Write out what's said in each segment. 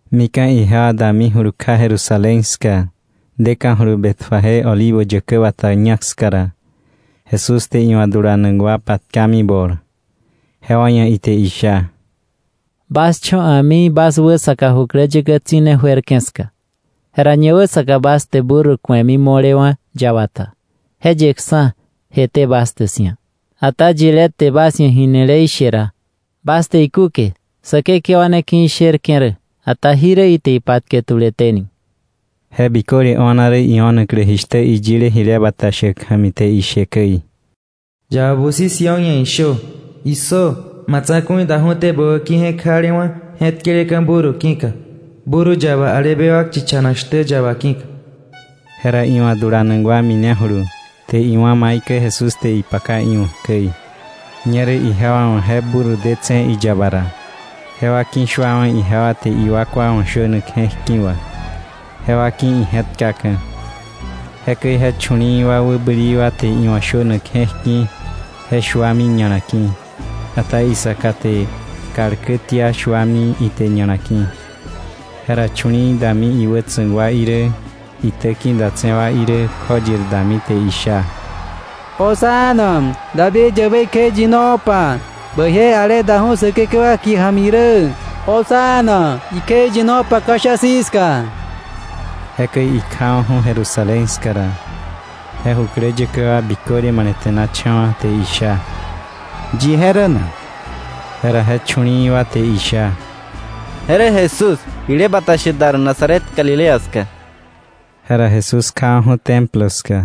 Mika̱ ijewa damijulu kja Jerusalén ska, deka̱julu Betfagé Olivo Yäkä Bata ñak ska ra, Jesús te iwa̱ dulanak wa patkami bol, jewa ia̱ ite isha: —Bas cho̱ a̱mi bas wäsaka jukläyäkä tsi̱ne juerke̱ ska. Jera ñawäsaka bas te burro ku̱emi mo̱lewa̱ yaba ta. Je yeksa̱, jeté bas te 'sia̱. Ata yilé te bas ia̱ jinile ishe ra, bas te ikúke: ‘Säkekewa ne ki̱ isherke̱ rä, ata jirä ite ipatke tuleténi.’ Je biköle o̱na rä, io̱naklä jishtä iyile jile bata shäk ja̱mi te ishe käi: “Yaba busi Sión ia̱ ishö: ‘¡Issö! Ma tsa̱ku̱i daju̱té bä wäki̱ je̱k jalewa̱, je̱tkeleka̱ burro ki̱ka, burro yaba, ale bewak chichanak shtä yaba ki̱ka.’ Jera iwa̱ dulanak wa minejulu, te iwá̱ maikäi Jesús te ipaka iwa̱k käi. Ñerä ijewa wa̱ je burro detse̱ iyaba ra, jewa ki̱shuawa̱ ijewa te iwakwa wa̱ shönak je̱k ki̱ wa, jewa ki̱ ije̱tkaka̱. Jekäi je chu̱li̱i̱ wa wäbäli wa te iwa̱ shönak je̱k ki̱ je shuami ña̱la ki̱, ata isaka te kal kä tia, shuami ite ña̱la ki̱. Jera chu̱li̱i̱ dami iwätsa̱k wa irä iitäki̱ datse̱ wa irä, kjoyir dami te isha; —¡Hosana, David yäbei kjeiyinopa! ¡Bäije ale daju̱ Säkekewa kie ja̱mi rä! ¡Hosana, ikjeiyinopa ka̱sha̱a̱ si̱ ska! Jekäi ikjawa̱ju̱ Jerusalén ska ra, je jukläyäkä wa biköle malete̱nacha̱wa̱, te isha: —¿Yi je rä na? Jera je chu̱li̱i̱ wa te isha: —Je rä Jesús, jile bata shäk dar Nazaret Galilea ska. Jera Jesús kjawa̱ju̱ Templo ska,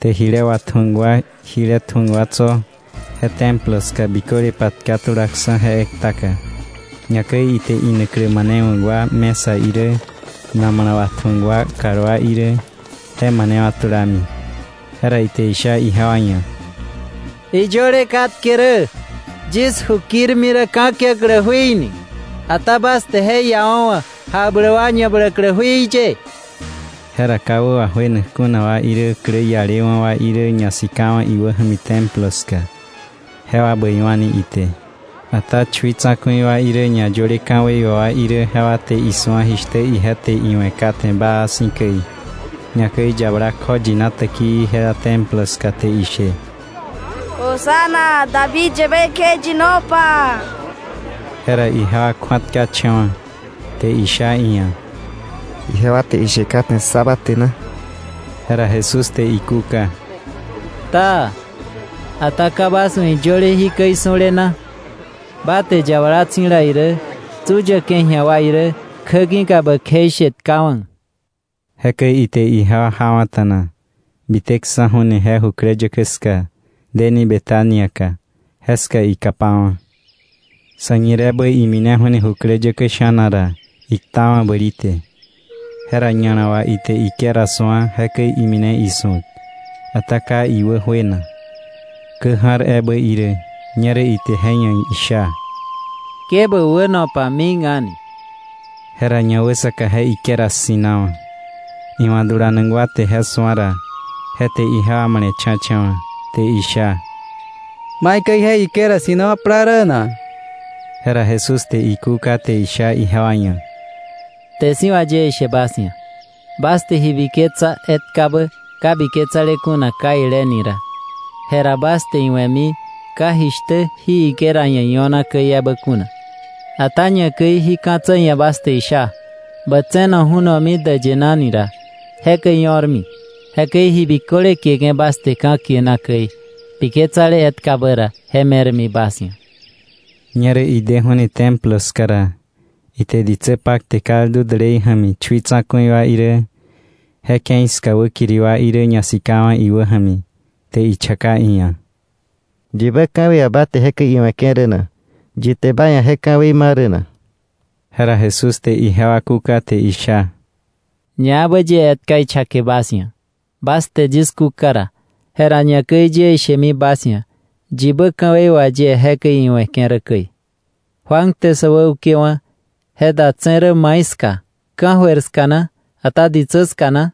te jile watju̱ak wa, jile tju̱ak wa tso̱ je Templo ska biköle patka tulaksa̱ je ektaka, ñakäi ite inaklä manewa̱k wa mesa irä, namala watju̱ak wa kalwá irä, je manewa̱ tulami. Jera ite isha ijewa ia̱: —Iyöle katke rä: ‘Yis ju kirmi rä ka̱kiäklä jui’, ata bas te je iawa̱wa̱ jakbläk wa ñabläklä jui ye. Jera ka wä wajuenak kuna wa irä klä ialewa̱ wa irä ñasikawa̱ iwäja̱mi Templo ska; jewa bäiwa̱ni ite. Ata chui tsa̱ku̱i wa irä ñayöle ka̱wei wà wa irä jewa te isu̱a jishtä ije te iwe̱ kate baa si̱ käi, ñakäi yabala kjoyina täkii jela Templo ska te ishe: “¡Hosana! ¡David yäbei kjeiyinopa!” je ra ijewa kju̱atkacha̱wa̱, te isha iia̱: —¿Ijewa te ishe kate ssa ba te na? Jera Jesús te ikúka: —Taa. ¿Ata ka bas wa̱ iyöle jikäi su̱le na? ‘Ba te yabala tsi̱dala irä, tsu yäke̱ ji̱a wa irä, kjä ki̱ka bä kjeishe tkawa̱.’ Jekäi ite ijewa jawa̱ta̱na, biteksa̱ju̱ni je jukläyäkä ska deni Betania ka, jeska ikapawa̱. Sa̱ñireebä imineju̱ni jukläyäkä sha̱na ra, iktawa̱ bäli te. Jera ña̱la wà ite higuera su̱a, jekäi imine isu̱ak, ata ka iwä juena, kä ja̱r ebä irä. Ñerä ite je ia̱ isha: —¡Ke bä wäno pa mik a̱ni! Jera ñawäsaka je higuera ssi̱nawa̱. Iwa̱ dulanak wa te je su̱a ra, je te ijewa male̱cha̱cha̱wa̱, te isha: —¿Maikäi je higuera ssi̱nawa̱ plaa rä na? Jera Jesús te ikúka te isha ijewa ia̱: —Kte si̱ wà yie ishe bas ia̱, bas te ji biketsa etkabä ka biketsale kuna kaile ni ra, jera bas te iwe̱mi ka jishtä jí higuera ia̱ io̱na käi ebä kuna, ata ñakäi jí ka̱tsä ia̱ bas te isha: “Bä tse̱no ju̱nomi däyë naka” ni ra, jekäi io̱rmi. Jekäi ji biköle kieke̱ bas te käi ka̱kie na biketsale etkabä ra, je me̱rmi bas ia̱. Ñerä ideju̱ni Templo ska ra, ite ditsä pakte kaldu dälei ja̱mi chui tsa̱ku̱i wa irä, je ke̱i ska wäkiri wa irä ñasikawa̱ iwä ja̱mi, te ichaka iia̱: —¿Yibä ka̱wei wà ba te jekäi iwe̱ke̱ rä na? ¿Yi te ba ia̱ je ka̱wei ma rä na? Jera Jesús te ijewa kúka te isha: —Ñaebä yie etka ichake bas ia̱, bas te yis kúka ra, jera ñakäi yie ishemi bas ia̱ yibä ka̱wei wà yie jekäi iwe̱ke̱ rä käi. Juan te sä wäukewa̱, ¿je datse̱ rä mai ska? ¿Ka̱jöir ska na, ata ditsä ska na?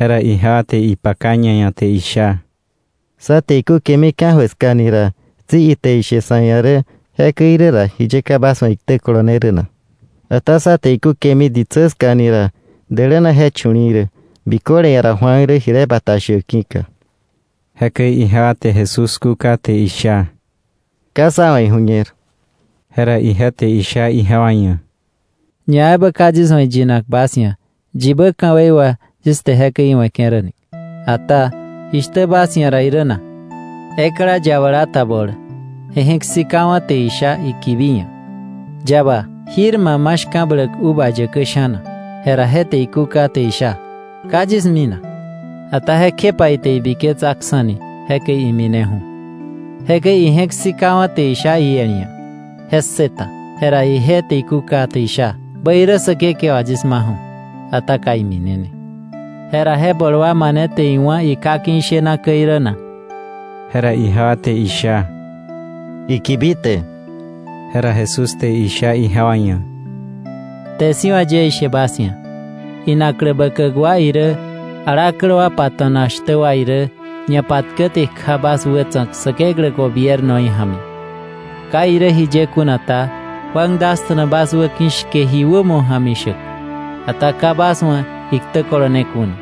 Jera ijewa te ipaka ñaia̱ te isha: “Sa te ikúkemi ka̱jöir ska ni ra, tsi ite ishe sa̱ ia̱ rä: ‘Jekäi irä ra, ¿jiye ka bas wa̱ iktä kolone rä na?’ Ata sa te ikúkemi ditsä ska ni ra, däläna je chu̱li̱i̱ rä, biköle ia̱ ra Juan rä jile bata shäk ki̱ka.” Jekäi ijewa te Jesús kúka te isha: —Ka sá wa̱ iju̱ñer. Jera ije te isha ijewa ia̱: —Ñaebä ka yis wa̱ iyinak bas ia̱, yibä ka̱wei wà yis te jekäi iwe̱ke̱ rä ni. “Ata, ¿jishtä bas ia̱ irä na? Ekla yabala ta bol, je je̱k sika wa̱ te isha ikibi ia̱: ‘Yaba, jir ba ma shka̱bläk uva yäkä sha̱na.’ Jera je te ikúka te isha: ‘Ka yis minak.’ Ata jekjepa ite ibiketsaksa̱ni, jekäi imineju̱. Jekäi ije̱k sikawa̱ te isha iel ia̱, je ssëta. Jera ije te ikúka te isha: ‘Bäirä säkekewa, yis maju̱.’ Ata ka iminene. Jera ¿je bol wa mane te iwá̱ iká ki̱ ishena käi rä na?” Jera ijewa te isha: —Ikibi te. Jera Jesús te isha ijewa ia̱: —Kte si̱ wà yie ishe bas ia̱, inaklä bäkäk wa irä, alaklä wa pato̱nak shtä wa irä, ñapatkäte kja bas wätsa̱k Säkeklä gobiernoí ja̱mi. Ka irä jiye kuna ta Juan dasta̱na bas wäki̱ shke ji wämo ja̱mi shäk, ata ka bas wa̱ iktä kolone kuna.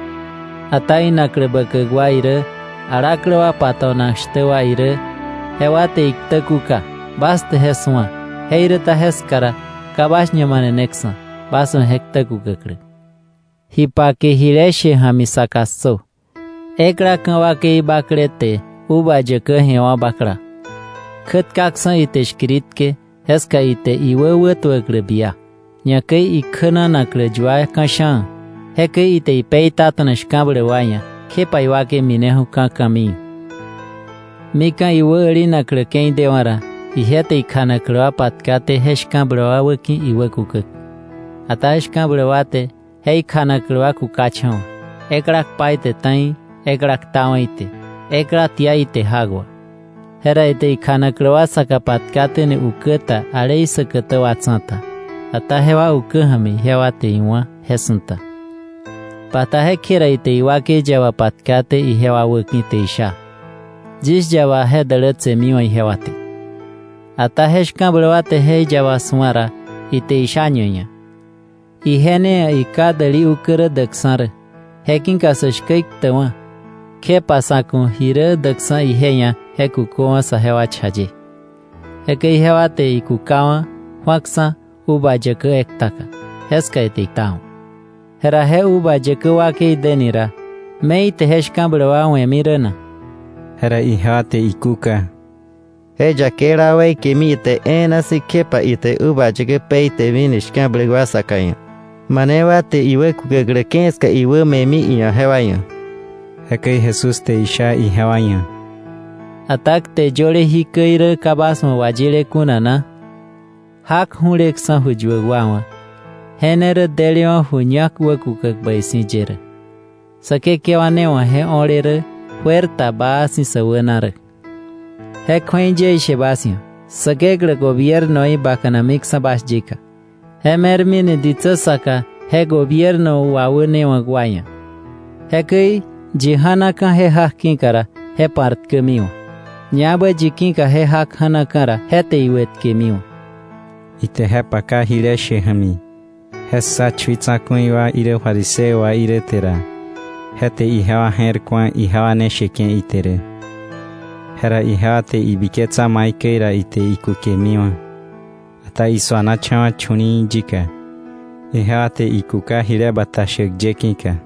Ata inaklä bäkäk wa irä alaklä wa pato̱nak shtä wa irä jewa te iktä kuka. Bas te je su̱a, jeiräta jeska ra ka bas ñamaneneksa̱, bas wa̱ je ktä kukäklä. “Ji pake jile she ja̱mi saka ssö: Ekla ka̱ wakei bakle, te uva yäkä je̱wa̱ bakla, kjätkaksa̱ ite shkiritke, jeska ite iwä wätuäklä bia, ñakäi ikjänanaklä yua ka̱sha̱a̱, jekäi ite je peitata̱na shka̱bläk wa ia̱, kjepa iwakei mineju̱mi ka̱ ka̱mii. Mika̱ iwä älinaklä ke̱i dewa̱ ra, ije te ikjanaklä wa patkaté je shka̱bläk wa wäki̱, iwä kukäk. Ata shka̱bläk wa te je ikjanaklä wa kukacha̱wa̱, ekla kpa ite ta̱i, ekla ktawa̱ ite, ekla tia ite jak wà. Jera ite kjanaklä wa saka patkaténi ukä ta ale isäkätä wa tsa̱ta, ata jewa ukä ja̱mi ijewa te iwá̱ je su̱ta. “Bata jekje ra ite iwakei yaba patkaté ijewa wäki̱, te isha: ‘Yis yaba je dälätsemiwa̱ ijewa te.’ Ata je shka̱bläk wa te je yaba su̱a ra, ite isha ñaia̱: ‘Ije ne ia̱ iká däli ukä rä däkksa̱ rä, je ki̱ka sä shkä iktäkwa̱, kjepa sa̱ ku̱ ji rä däkksa̱ iia̱ je kuköwa̱ saje cha ye.’ Jekäi ijewa te ikukawa̱ ju̱aksa̱ uva yäkä ektaka, jeska ite iktawa̱. “Jera je uva yäkä wakei deni ra, ¿me ite je shka̱bläk wa we̱mi rä na?” Jera ijewa te ikúka: —Je yakeila wa weikemi ite e̱e̱na si̱, kjepa ite uva yäkä peitemini shka̱bläk wa saka ia̱, mane wa te iwä kukäklä ke̱i ska iwä me̱mi iia̱ jewa ia̱. Jekäi Jesús te isha ijewa ia̱: —¿Ata kte yöle jikäi rä ka wayile kuna bas wa̱ na? ‘Jak ju̱leksa̱ ju yuäk wa wa̱, je ne rä delewa̱ ju ñak wäkukäk bäi si̱ ye rä. Säkekewa ne wa̱ je o̱le rä, juer ta baa si̱ sä wäna rä. Je kju̱ei yie ishe bas ia̱: Säkeklä gobiernoí bakanamiksa̱ bas yika, je me̱rmi ni ditsä saka je gobierno wawänewa̱k wa ia̱. Jekäi yi ja̱naka̱ je jak ki̱ka ra, je pa̱rtkämiwa̱; ñaebä yi ki̱ka je jak ja̱naka̱ ra, je te iwëtkemiwa̱. Ite je paka jile she ja̱mi, je ssa chui tsa̱ku̱i wa irä fariseo wa irä te ra, je te ijewa je̱r ku̱a, ijewa ne sheke̱ ite rä. Jera ijewa te ibiketsa maikäi ra ite ikukemiwa̱; ata isuanacha̱wa̱ chu̱li̱i̱ yika, ijewa te ikuka jile bata shäk ye ki̱ka.